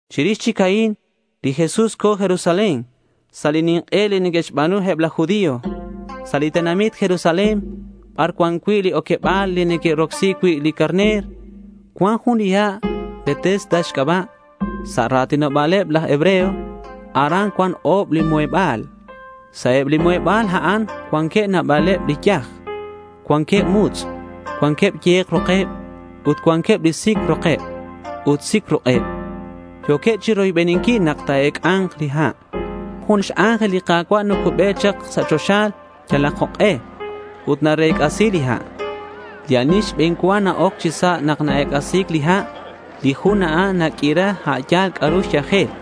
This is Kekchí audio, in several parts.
Chirix chic a'in, li Jesús co̱ Jerusalén sa' li nink'e li neque'xba̱nu eb laj judío. Sa' li tenamit Jerusalén bar cuan cui' li oqueba̱l li neque'rocsi cui' li carner, cuan jun li ha' Betesda xc'aba' sa' ra̱tinoba̱leb laj hebreo. Aran cuan o̱b li muheba̱l. Sa' eb li muheba̱l a'an cuanqueb nabaleb li yaj. Cuanqueb mutz', cuanqueb ye̱k rokeb, ut cuanqueb li sic rokeb ut sic ruk'eb. Yo̱queb chiroybeninquil nak ta̱ec'a̱nk li ha'. Jun x-ángel li Ka̱cua' nacube chak sa' choxa yalak jok'e ut narec'asi li ha'. Li ani xbe̱n cua na-oc chi sa' nak ac x-ec'asi̱c li ha', li jun a'an naq'uira a' yal c'a'ru xyajel.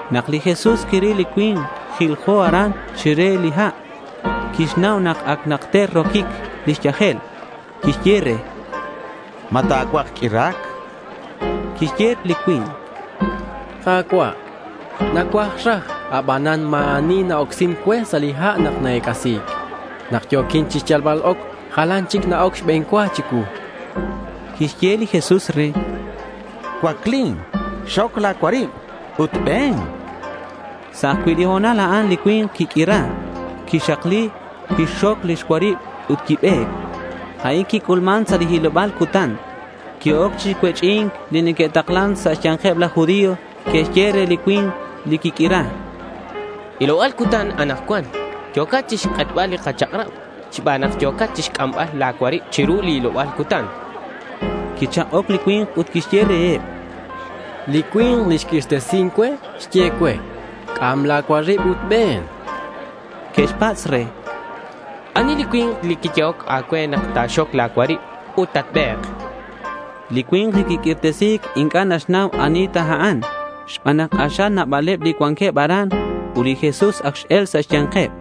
Nak li Jesús quiril li cui̱nk jiljo aran chire li ha' quixnau nak ac najter roquic lix yajel. Quixye re: —¿Ma ta̱cuaj q'uira̱c? chan re. Quixye li cui̱nk: —Ka̱cua', nacuaj raj abanan ma̱ ani na-ocsin cue sa' li ha' nak na-ec'asi̱c. Nak yo̱quin chixyalbal oc, jalan chic na-oc xbe̱n cua chicuu, chan. Quixye li Jesús re: —Cuaclin, xoc la̱ cuarib ut be̱n, chan re. Sa' ajcui' li ho̱nal a'an li cui̱nk quiq'uira. Quixakli, quixxoc lix cuarib ut quibe̱c. A'in quic'ulman sa' li hiloba̱l cutan. Que'oc chi cuech'i̱nc li neque'taklan sa' xya̱nkeb laj judío. Que'xye re li cui̱nk li quiq'uira: —Hiloba̱l cutan anakcuan. Yo̱cat chixk'etbal li kachak'rab xban nak yo̱cat chixc'ambal la̱ cuarib chiru li hiloba̱l cutan, chanqueb. Quichak'oc li cui̱nk ut quixye reheb: —Li cui̱nk li xq'uirtesin cue, xye cue, “c'am la̱ cuarib ut be̱n”, chan. Que'xpatz' re: —¿Ani li cui̱nk li xyehoc a̱cue nak ta̱xoc la̱ cuarib ut tatbe̱k? chanqueb. Li cui̱nk li quiq'uirtesi̱c inc'a' naxnau ani ta a'an, xban nak k'axal nabaleb li cuanqueb aran ut li Jesús ac x-el sa' xya̱nkeb.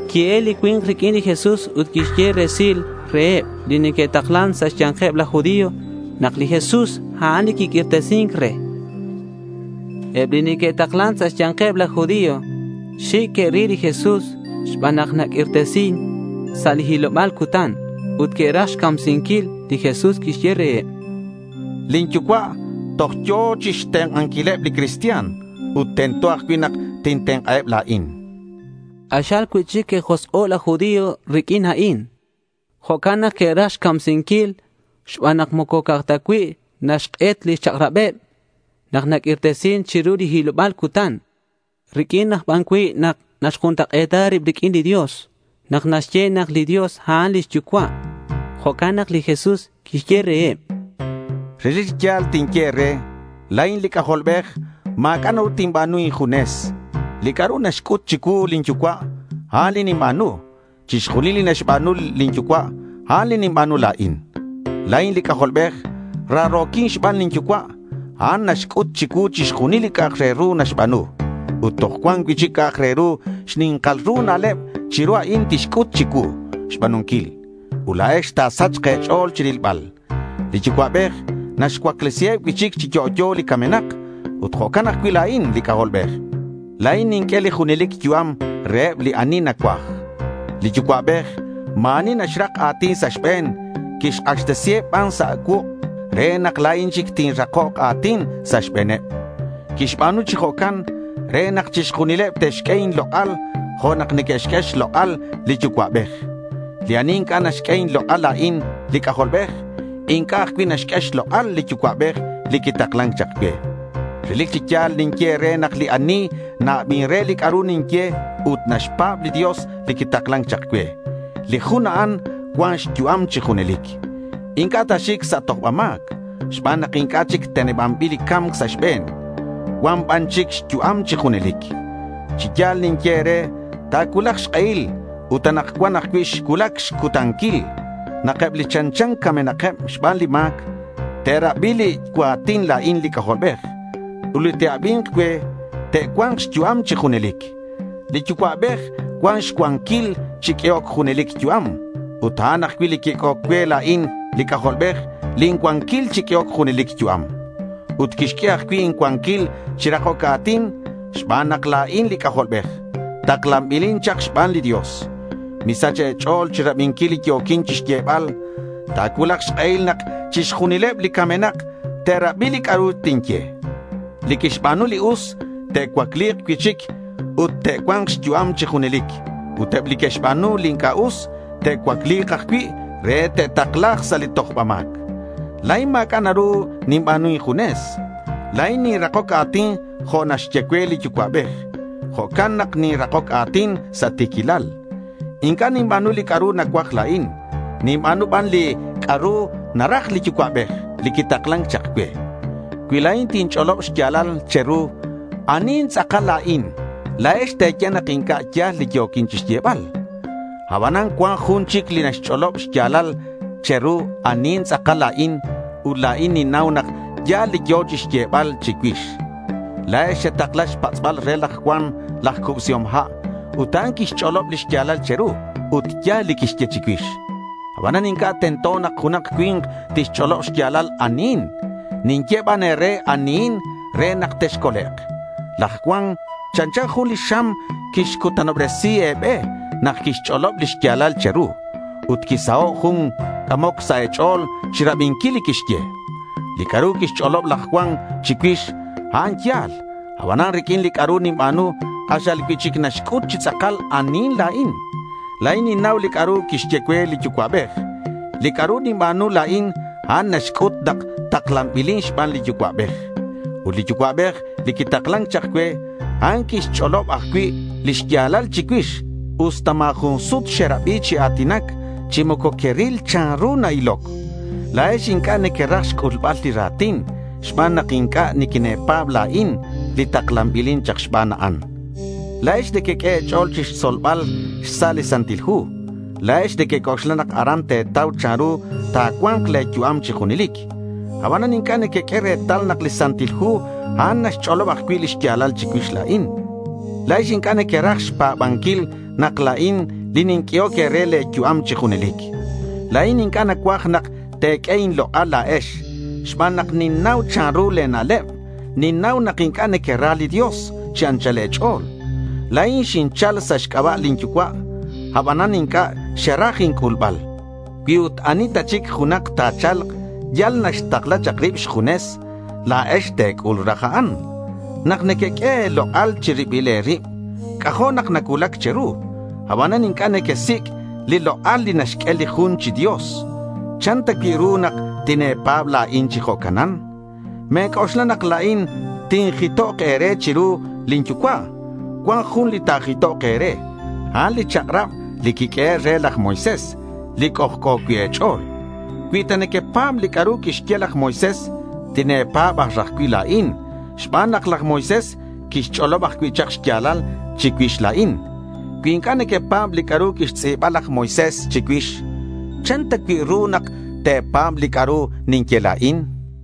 Qui-el li cui̱nk riq'uin li Jesús ut quixye resil reheb li neque'taklan sa' xya̱nkeb laj judío nak li Jesús, a'an li quiq'uirtesin re. Eb li neque'taklan sa' xya̱nkeb laj judío xic' que'ril li Jesús xban nak naq'uirtesin sa' li hiloba̱l cutan. Ut que'raj xcamsinquil. Li Jesús quixye reheb: —Lin Yucua' toj yo̱ chixtenk'anquileb li cristian ut tento ajcui' nak tintenk'aheb la̱in, chan. K'axal cui'chic que'josk'o' laj judío riq'uin a'in. Jo'can nak que'raj xcamsinquil xban nak moco ca'aj ta cui' naxk'et lix chak'rabeb nak naq'uirtesin chiru li hiloba̱l cutan; riq'uin aj ban cui' nak naxjuntak'e̱ta rib riq'uin li Dios nak naxye nak li Dios, a'an lix Yucua'. Jo'can nak li Jesús quixye reheb: —Relic chi ya̱l tinye e̱re, La̱in li C'ajolbej. Ma̱c'a' naru tinba̱nu injunes. Li c'a'ru naxc'ut chicuu lin Yucua', a'an li ninba̱nu. Chixjunil li naxba̱nu lin Yucua', a'an li ninba̱nu la̱in. La̱in li C'ajolbej. Raro̱quin xban lin Yucua'. A'an naxc'ut chicuu chixjunil li c'a'ak re ru naxba̱nu. Ut toj cuan cui'chic c'a'ak re ru xni̱nkal ru na'leb chiru a'in tixc'ut chicuu xba̱nunquil. Ut la̱ex ta̱sachk e̱ch'o̱l chirilbal. Li Yucua'bej naxcuaclesiheb cui'chic chi yo'yo li camenak. Ut jo'can ajcui' la̱in li C'ajolbej. La̱in ninq'ue li junelic yu'am reheb li ani nacuaj. Li Yucua'bej ma̱ ani naxrak a̱tin sa' xbe̱n. Quixk'axtesiheb ban sa' cuuk' re nak la̱in chic tinrakok a̱tin sa' xbe̱neb. Quixba̱nu chi jo'can re nak chixjunileb te'xq'ue inlok'al jo' nak neque'xq'ue xlok'al li Yucua'bej. Li ani inc'a' naxq'ue inlok'al la̱in li C'ajolbej, inc'a' ajcui' naxq'ue xlok'al li Yucua'bej li quitaklan chak cue. Relic chi ya̱l ninye e̱re nak li ani na-abin re li c'a'ru ninye ut naxpa̱b li Dios li quitaklan chak cue, li jun a'an cuan xyu'am chi junelic. Inc'a' ta̱xic sa' tojba ma̱c xban nak inc'a' chic tenebanbil li ca̱mc sa' xbe̱n. Cua̱nk ban chic xyu'am chi junelic. Chi ya̱l ninye e̱re ta̱cuulak xk'ehil ut anakcuan ajcui' xcuulac xcutanquil, nak eb li chanchan camenakeb xban li ma̱c te'rabi li cua̱tin la̱in li C'ajolbej. Ut li te'abi̱nk cue te'cua̱nk xyu'am chi junelic. Li Yucua'bej cuan xcuanquil chi q'uehoc junelic yu'am ut a'an ajcui' quiq'uehoc cue la̱in li C'ajolbej lin cuanquil chi q'uehoc junelic yu'am. Ut quixq'ue ajcui' incuanquil chi rakoc a̱tin xban nak la̱in li C'ajolbej. Taklanbilin chak xban li Dios. Misach e̱ch'o̱l chirabinquil li yo̱quin chixyebal. Ta̱cuulak xk'ehil nak chixjunileb li camenak te'rabi li c'a'ru tinye. Li que'xba̱nu li us te'cuacli̱k cui'chic ut te'cua̱nk xyu'am chi junelic. Ut eb li que'xba̱nu li inc'a' us te'cuacli̱k ajcui' re te'takla̱k sa' li tojba ma̱c. La̱in ma̱c'a' naru ninba̱nu injunes. La̱in ninrakoc a̱tin jo' naxye cue li Yucua'bej. Jo'can nak ninrakoc a̱tin sa' ti̱quilal. Inc'a' ninba̱nu li c'a'ru nacuaj la̱in. Ninba̱nu ban li c'a'ru naraj li Yucua'bej li quitaklan chak cue. Cui la̱in tinch'olob xya̱lal che̱ru anihin tz'akal la̱in, la̱ex te̱ye nak inc'a' ya̱l li yo̱quin chixyebal. Abanan cuan jun chic li naxch'olob xya̱lal che̱ru anihin tz'akal la̱in ut la̱in ninnau nak ya̱l li yo̱ chixyebal chicuix. La̱ex xetakla xpatz'bal re laj Juan laj Cubsihom Ha' ut a'an quixch'olob li xya̱lal che̱ru ut ya̱l li quixye chicuix. Abanan inc'a' tento nak junak cui̱nk tixch'olob xya̱lal anihin. Ninye ban e̱re anihin re nak texcolek'. Laj Juan chanchan jun li xam quixcutanobresi e̱be nak quixch'olob li xya̱lal che̱ru. Ut quisaho' jun c'amoc sa' e̱ch'o̱l chirabinquil li quixye. Li c'a'ru quixch'olob laj Juan chicuix, a'an ya̱l. Abanan riq'uin li c'a'ru ninba̱nu, k'axal cui'chic naxc'ut chi tz'akal anihin la̱in. La̱in ninba̱nu li c'a'ru quixye cue li Yucua'bej. Li c'a'ru ninba̱nu la̱in, a'an naxc'ut nak taklanbilin xban li Yucua'bej. Ut li Yucua'bej li quitaklan chak cue, a'an quixch'olob ajcui' li xya̱lal chicuix usta ma̱ jun sut xerabi chi a̱tinac chi moco queril chanru na-iloc. La̱ex inc'a' nequeraj xc'ulbal li ra̱tin xban nak inc'a' niquine̱pa̱b la̱in, li taklanbilin chak xban a'an. La̱ex nequeq'ue e̱ch'o̱l chixtzolbal xsa' li Santil Hu. La̱ex nequec'oxla nak aran te̱tau chanru ta̱cua̱nk le̱ yu'am chi junelic. Abanan inc'a' nequeq'ue retal nak li Santil Hu a'an naxch'olob ajcui' li xya̱lal chicuix la̱in. La̱ex inc'a' nequeraj xpa̱banquil nak la̱in ninq'uehoc e̱re le̱ yu'am chi junelic. La̱in inc'a' nacuaj nak te̱q'ue inlok'al la̱ex, xban nak ninnau chanru le̱ na'leb. Ninnau nak inc'a' nequera li Dios chi anchal e̱ch'o̱l. La̱in xinchal sa' xc'aba' lin Yucua'. Abanan inc'a' xeraj inc'ulbal. Cui ut ani ta chic junak ta̱cha̱lk yal naxtakla chak rib xjunes, la̱ex te̱c'ul raj a'an. Nak nequeq'ue e̱lok'al chi ribil e̱rib, c'ajo' nak nacuulac che̱ru. Abanan inc'a' nequesic' li lok'al li naxq'ue li jun chi Dios. ¿Chan ta cui' ru nak tine̱pa̱b la̱in chi jo'canan? Me̱c'oxla nak la̱in tinjitok e̱re chiru lin Yucua'. Cuan jun li ta̱jitok e̱re. A'an li chak'rab li quiq'uehe' re laj Moisés li c'ojc'o cui' e̱ch'o̱l. Cui ta nequepa̱b li c'a'ru quixye laj Moisés, tine̱pa̱b aj raj cui' la̱in xban nak laj Moisés quixch'olob ajcui' chak xya̱lal chicuix la̱in. Cui inc'a' nequepa̱b li c'a'ru quixtz'i̱ba laj Moisés chicuix, ¿chan ta cui' ru nak te̱pa̱b li c'a'ru ninye la̱in?